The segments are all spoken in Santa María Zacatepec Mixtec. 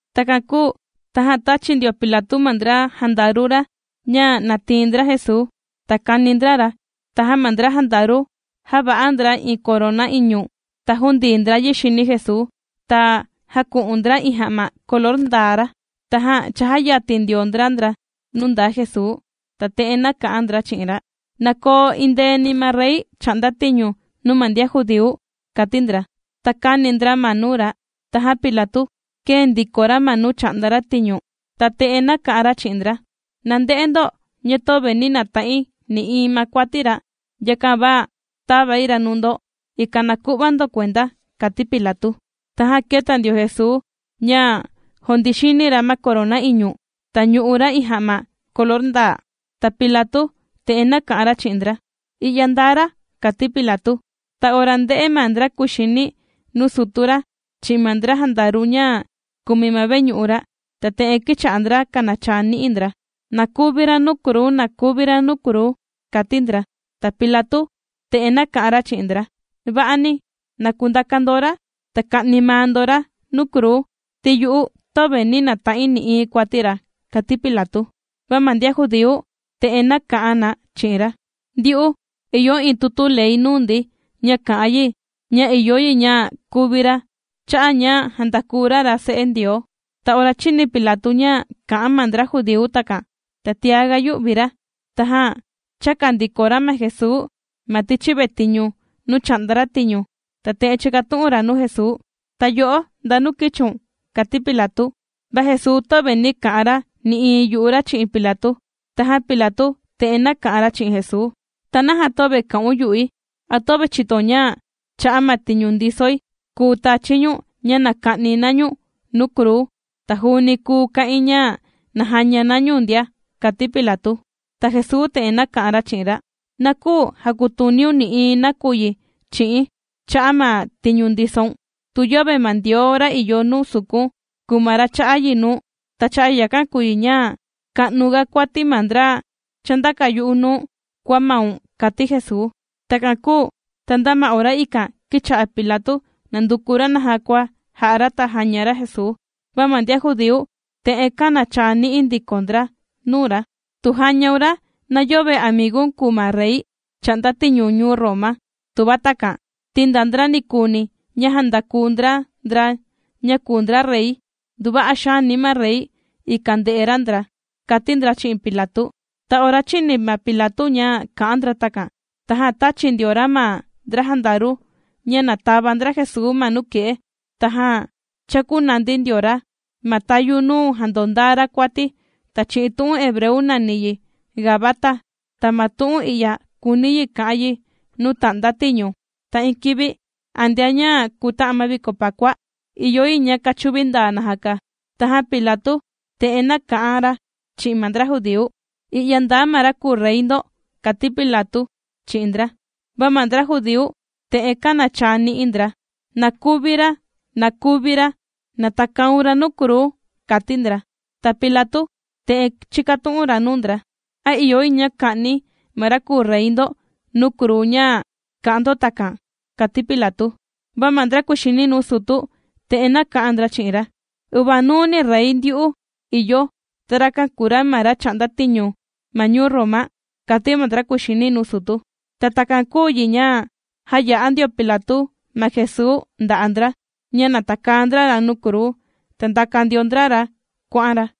Takan kūu tajan tāchi ndio Pilatu ma ndra jandaru ra, ña na tiin ndra Jesuu, ta kani ndra ra. Tajan ma ndra jandaru jāva'a ndra iin korona iñu, ta jūndii ndra yi xini Jesuu, ta jāku'un ndra iin ja'ma color ndaa ra. Tajan chājayatin ndio ndra ndra nuu ndaa Jesuu, ta te'en nāka'an ndra chi'in ra: ―¡Na koo endeeni ma rey chà'nda tiñu nuu ma ndian judíu! ―kàti ndra. Ta kāni ndra ma nuu ra. Tajan ma Pilatu kēe ndiko ra ma nuu chà'nda ra tiñu, ta te'en nāka'an ra chi'in ndra: ―Na nde'e ndo, ña töve nī nata'in nï'iin ma kuati ra, yakan va tāvai ra nuu ndo, ikan na ku'va ndo kuenda ―kàti Pilatu. Tajan kēta ndio Jesuu, ña jùndii xini ra ma korona iñu, ta ñù'u ra iin ja'ma color ndaa. Ta Pilatu te'en nāka'an ra chi'in ndra: ―¡I'ya ndaa ra! ―kàti Pilatu. Ta ora ndē'e ma ndra kuxini nuu sutu ra, chi'in ma ndra jandaru ña kùmi ma veñu'u ra, ta te'en kīcha'a ndra kànachaa ni'i ndra: ¡Na kuvi ra nuu kruu! ¡Na kuvi ra nuu kruu! ―kàti ndra. Ta Pilatu te'en nāka'an ra chi'in ndra: ―Va'ani, na kundaka ndo ra, ta ka'ni maa ndo ra nuu kruu, ti yu'u töve nī nata'in nï'iin kuati ra ―kàti Pilatu. Va ma ndian judíu te'en nāka'an na chi'in ra: ―Ndyu'u, ìyo iin tutu ley nuu ndi, ña kà'an yi, ña ìyo yi ña kuvi ra cha'a' ña jàndaku ra ra Se'e Ndioo. Ta ora chīni Pilatu ña kā'an ma ndra judíu takan, ta tiaga yū'vi ra. Tajan chāka ndiko ra ma Jesuu ma tichi vetiñu nuu chà'nda ra tiñu, ta te'en chīkatu'un ra nuu Jesuu: ―¿Ta yo'o ndanu kīchiun? ―kàti Pilatu. Va Jesuu töve nī ka'an ra nï'iin yu'u ra chi'in Pilatu. Tajan Pilatu te'en nāka'an ra chi'in Jesuu: ―¿Ta naja töve kà'un yu'i? ¿A töve chìtoun ña cha'a' ma tiñu ndisoi, kùu tachi̱ ñu̱n ña na ka'ni na ñu̱n nuu kruu, ta juuni kùu ka'in ña na jaña na ñu̱n ndia? ―kàti Pilatu. Ta Jesuu te'en nāka'an ra chi'in ra: ―Na küu jakutuniun nï'iin nakuyi chi'i̱n cha'a' ma tiñu ndisoun, tu yöve ma Ndioo ra ìyo nuu sukun, kùu ma ra chà'a yi nuu̱n. Ta cha'a' yakan kùu yi ña ka'nuga kuati ma ndra chāndaka yu'u nuu̱n, kua maun ―kàti Jesuu. Takan kūu ta nda ma ora ikan, kīcha'a Pilatu, nànduku ra naja kua jà'a ra, ta jàña ra Jesuu, va ma ndian judíu, te'en kānachaa ni'i ndiko ndra nuu ra: ―¡Tu jàñaun ra, na yöve amigu̱n kùu ma rey chà'nda tiñu ñuu Roma tuva takan, ti nda ndra nikuuni ña jàndaku ndra ndra ña kùu ndra rey, nduva'a xaani ma rey ikan ndè'e ra ndra! ―kàti ndra chi'in Pilatu. Ta ora chīni ma Pilatu ña kā'an ndra takan, tajan tāchi ndio ra ma ndra jandaru ña na tava ndra Jesuu ma nuke'e, tajan chākunandi ndio ra ma tayu nuu jàndondaa ra kuati, ña chi'in tu'un hebreu nàni yi, Gabata, ta ma tu'un i'ya kùuni yi ka'an yi, Nuu Tà'nda Tiñu. Ta iin kivi antea ña kuta'an ma viko Pakua, ìyo yi a kachuvi ndaa najaka. Tajan Pilatu te'en nāka'an ra chi'in ma ndra judíu: ―¡I'ya ndaa ma ra kùu rey ndo! ―kàti Pilatu chi'in ndra. Va ma ndra judíu te'en kānachaa ni'i ndra: ―¡Na kuvi ra! ¡Na kuvi ra! ¡Na takaun ra nuu kruu! ―kàti ndra. Ta Pilatu te'en chīkatu'un ra nuu ndra: ―¿A ìyo yi ña ka'ni̱ ma ra kùu rey ndo nuu kruu ña kà'an ndo takan? ―kàti Pilatu. Va ma ndra kùxini nuu sutu, te'en nāka'an ndra chi'in ra: ―¡Uvanuu ni rey ndyu'u ìyo, ta rakan kùu ra ma ra chà'nda tiñu ma ñuu Roma! ―kàti ma ndra kùxini nuu sutu. Ta takan kūu yi ña jāya'a ndio Pilatu, ma Jesuu nda'a' ndra, ña na takaa ndra ra nuu kruu, ta ndàka ndio ndra ra kuà'an ra.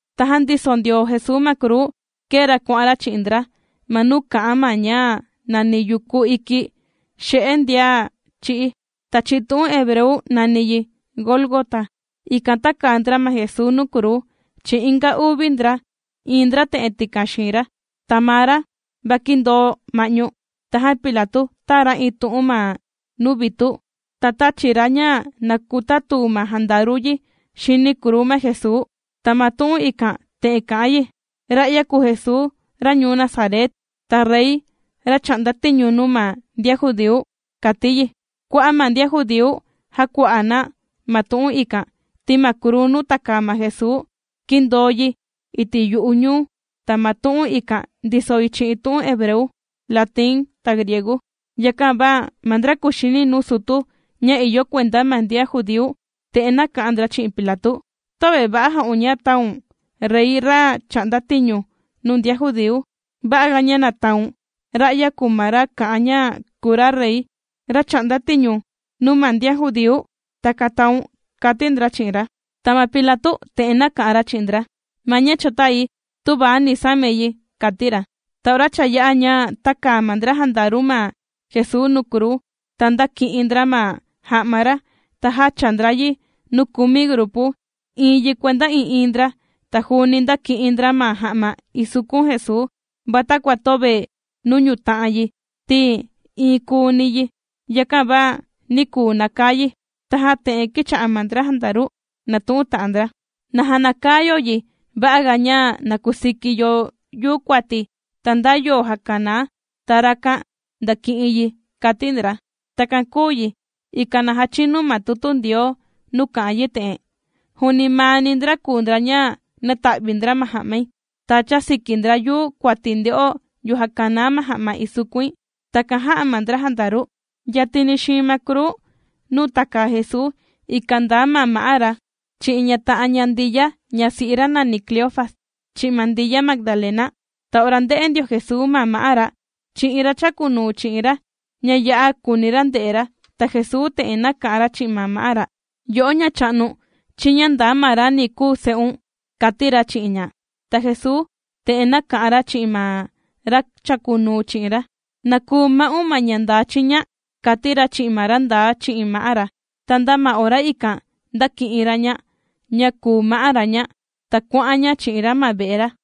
Tajan ndiso ndio Jesuu ma kruu, kēe ra kuà'an ra chi'in ndra, ma nuu kà'an na ña nàni Yuku Iki Xini Ndian Chī'í. Ta chi'in tu'un hebreu nàni yi, Gólgota. Ikan tākaa ndra ma Jesuu nuu kruu, chi'in inga uvi ndra, iin ndra te'en tikan xiin ra, ta maa ra, va kìndoo ma'ñu. Tajan Pilatu tāa ra iin tu'un ma nuu vitu, ta tāchi ra ña na kutatuu ma jandaru yi xini kruu ma Jesuu, ta ma tu'un ikan te'en kà'an yi: “Ra'ya kùu Jesuu ra ñuu Nazaret, ta rey, ra chà'nda tiñu nuu ma ndian judíu”, kàti yi. Kua'a' ma ndian judíu jākua'a na ma tu'un ikan, ti ma kruu nuu tākaa ma Jesuu kìndoo yi iti' yu'u ñuu, ta ma tu'un ikan ndiso yi chi'in tu'un hebreu, latinu ta griegu. Yakan va ma ndra kuxini nuu sutu, ña ìyo kuenda ma ndian judíu, te'en nāka'an ndra chi'in Pilatu: ―Töve va'a jā'un ña taun: “Rey ra chà'nda tiñu nuu ndian judíu.” Va'a ga ña na taun: “Ra'ya kùu ma ra kà'an ña kùu ra rey ra chà'nda tiñu nuu ma ndian judíu.” Takan taun ―kàti ndra chi'in ra. Ta ma Pilatu te'en nāka'an ra chi'in ndra: ―Ma ña cha tāi, tüva ni samai yi ―kàti ra. Ta ora cha yā'a ña tākaa ma ndra jandaru ma Jesuu nuu kruu, ta ndāki'in ndra ma ja'ma ra, ta jāchaa ndra yi nuu kumi grupu, iin yi kuenda ii'iin ndra. Ta juuni ndāki'in ndra ma ja'ma ìsukun Jesuu, va takua töve nuu ñùta'an yi, ti iin kuuni yi yakan va nī kuu nakaa yi. Tajan te'en kīcha'a ma ndra jandaru nàtu'un ta'an ndra: ―Na jänakaa yo yi, va'a ga ña na kusiki yo yuu kuati, ta nda yo jakanaa, ta rakan ndàki'in yi ―kàti ndra. Takan kūu yi, ikan na jachinu ma tutu Ndioo nuu kà'an yi te'en: Juuni maa ni ndra kùu ndra ña nāta'vi ndra ma ja'mai, ta chāsiki ndra yuu kuati nde'o yo jakanaa ma ja'ma isukuin. Takan jā'a ma ndra jandaru. Yatini xiin ma kruu nuu tàkaa Jesuu, ikan ndaa ma ma'á ra, chi'in ña ta'an ña, ta Ndiya ñasi'i ra nàni Cleofas, chi'in ma Ndiya Magdalena. Ta ora ndē'e ndio Jesuu ma ma'á ra, chi'in iin ra chàkunuu chi'in ra, ña ya'a kùuni ra nde'e ra, ta Jesuu te'en nāka'an ra chi'in ma ma'á ra: ―Yo'o ma'á, chiña ndaa ma ra ni kuu se'un ―kàti ra chi'in ña. Ta Jesuu te'en nāka'an ra chi'in ma ra chàkunuu chi'in ra: ―Chiña ndaa ma ña kuu ma'un ―kàti ra chi'in ma ra ndaa chi'in ma'á ra. Ta nda ma ora ikan, ndāki'in ra ña, ña kùu ma'á ra ña. Ta kuà'an ña chi'in ra ma ve'e ra.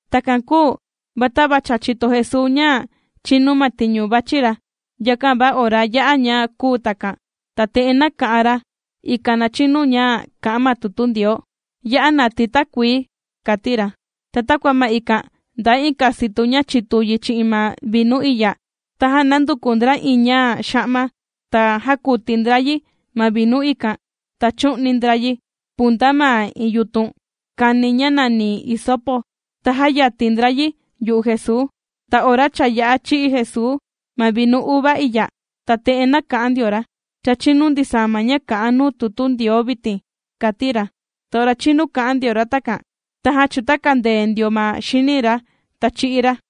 Takan kūu va tava cha chìto Jesuu ña chīnu ma tiñu vàchi ra, yakan va ora yā'a ña kūu takan, ta te'en nāka'an ra, ikan na chinu ña kà'an ma tutu Ndioo: ―Ya'a natii̱ takuii ―kàti ra. Ta takua ma ikan ndaa iin kasitu ña chitu yi chi'in ma vinu iya, tajan nānduku ndra iin ña xa'ma, ta jākuti ndra yi chi'in ma vinu ikan, ta chū'ni ndra yi punta ma iin yutun kani ña nàni hisopo, ta jāyatin ndra yi yu'u Jesuu. Ta ora cha yā'a chī'i Jesuu ma vinu uva iya, ta te'en nāka'an ndio ra: ―Cha chìnu ndisaa ma ña kà'an nuu tutu Ndioo vitin ―kàti ra. Ta ora chīnu kā'an ndio ra takan, tajan chūtakandee ndio ma xini ra, ta chī'í ra.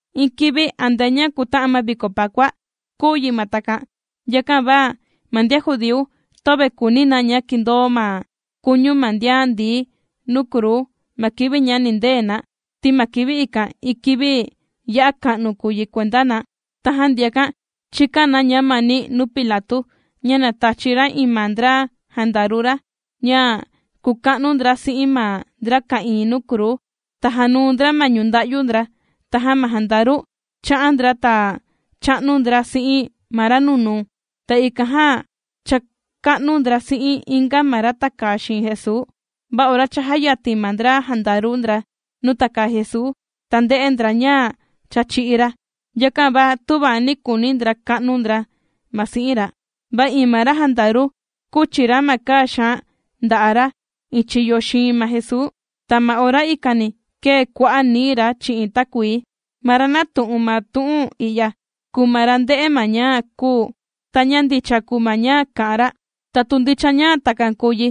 Iin kivi antea ña kūta'an ma viko Pakua, kūu yi ma takan. Yakan va ma ndian judíu töve kùuni na ña kindoo ma kuñu ma ndian ndií nuu kruu ma kivi ña nindee na, ti ma kivi ikan, iin kivi ya'a ka'nu kùu yi kuenda na. Tajan ndiakan chīkan na ñamani nuu Pilatu ña na tachi ra iin ma ndra jandaru ra, ña kuka'nu ndra si'in ma ndra ka'ìin nuu kruu, ta jànuu ndra ma ñunda'yu ndra. Tajan ma jandaru, chā'an ndra, ta chā'nu ndra si'in ma ra nunuu, ta ikan jan chāka'nu ndra si'in inga ma ra tàkaa xiin Jesuu. Va ora cha jāyatin ma ndra jandaru ndra nuu tàkaa Jesuu, ta ndē'e ndra ña cha chī'í ra. Yakan va tüva nī kuuni ndra ka'nu ndra ma si'in ra. Va iin ma ra jandaru kūchi ra ma kaa xaan nda'a' ra iin chiyo xiin ma Jesuu, ta ma ora ikani kēe kua'a' nií ra chi'in takuii. Ma ra nātu'un ma tu'un i'ya, kùu ma ra ndē'e ma ña kūu, ta ña ndicha kùu ma ña kà'an ra. Ta tu ndicha ña takan kùu yi,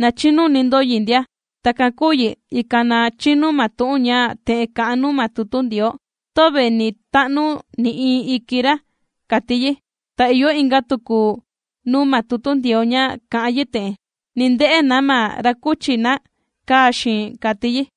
na chinuni ndo yi ndia. Takan kūu yi, ikan na chinu ma tu'un ña te'en kà'an nuu ma tutu Ndioo: “Töve ni ta'nu nï'iin iki ra”, kàti yi. Ta ìyo inga tuku nuu ma tutu Ndioo ña kà'an yi te'en: “Ni nde'e na ma ra kūchi na kaa xiin”, kàti yi.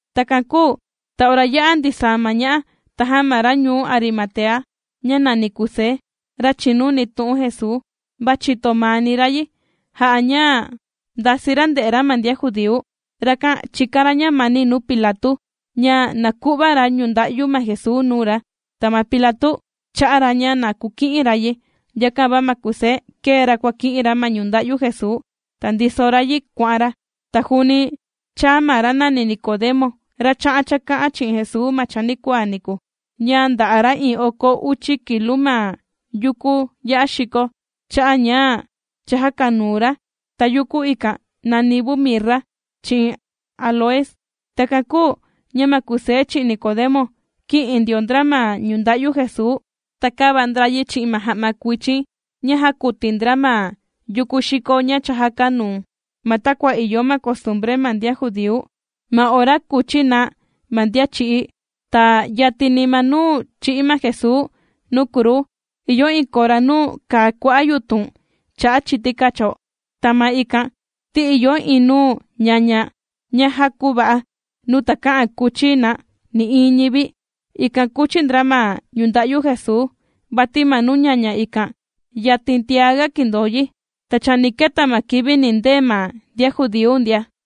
Takan kūu ta ora yā'a ndisaa ma ña'a, tajan ma ra ñuu Arimatea ña nàni Kusé, ra chìnuni tu'un Jesuu, va chìto maani ra yi, jà'a ña ndasii ra nde'e ra ma ndian judíu. Rakan chìkan ra ñamani nuu Pilatu ña na ku'va ra ñunda'yu ma Jesuu nuu ra. Ta ma Pilatu chā'a ra ña na kuki'in ra yi. Yakan va ma Kusé kēe ra kuàki'in ra ma ñunda'yu Jesuu, ta ndiso ra yi kuà'an ra. Ta juuni chāa ma ra nàni Nicodemo, ra chā'an chāka'an chi'in Jesuu ma chanikuaa niku, ña nda'a ra iin oko uchi kilu ma yukú ya'a xiko cha'an ña cha jàkanuu ra. Ta yuku ikan nàni vu mirra chi'in áloes. Takan kūu ña ma Kusé chi'in Nicodemo, kī'in ndio ndra ma ñunda'yu Jesuu, ta kāva ndra yi chi'in ma ja'ma kuichin ña jākuti ndra ma yukú xiko ña cha jākanuu, ma takua ìyo ma costumbre ma ndian judíu, ma ora kùchi na ma ndian chī'í. Ta yatini ma nuu chī'í ma Jesuu nuu kruu, ìyo iin kora nuu kàa kua'a' yutun chà'a chiti kacho, ta ma ikan ti ìyo iin nuu ñaña ña já kūva'a, nuu takä'an kuchi na nï'iin ñivi. Ikan kūchi ndra ma ñunda'yu Jesuu, vati ma nuu ñaña ikan, yatin tiaga kìndoo yi, ta cha ni keta ma kivi nindee ma ndian judíu ndia.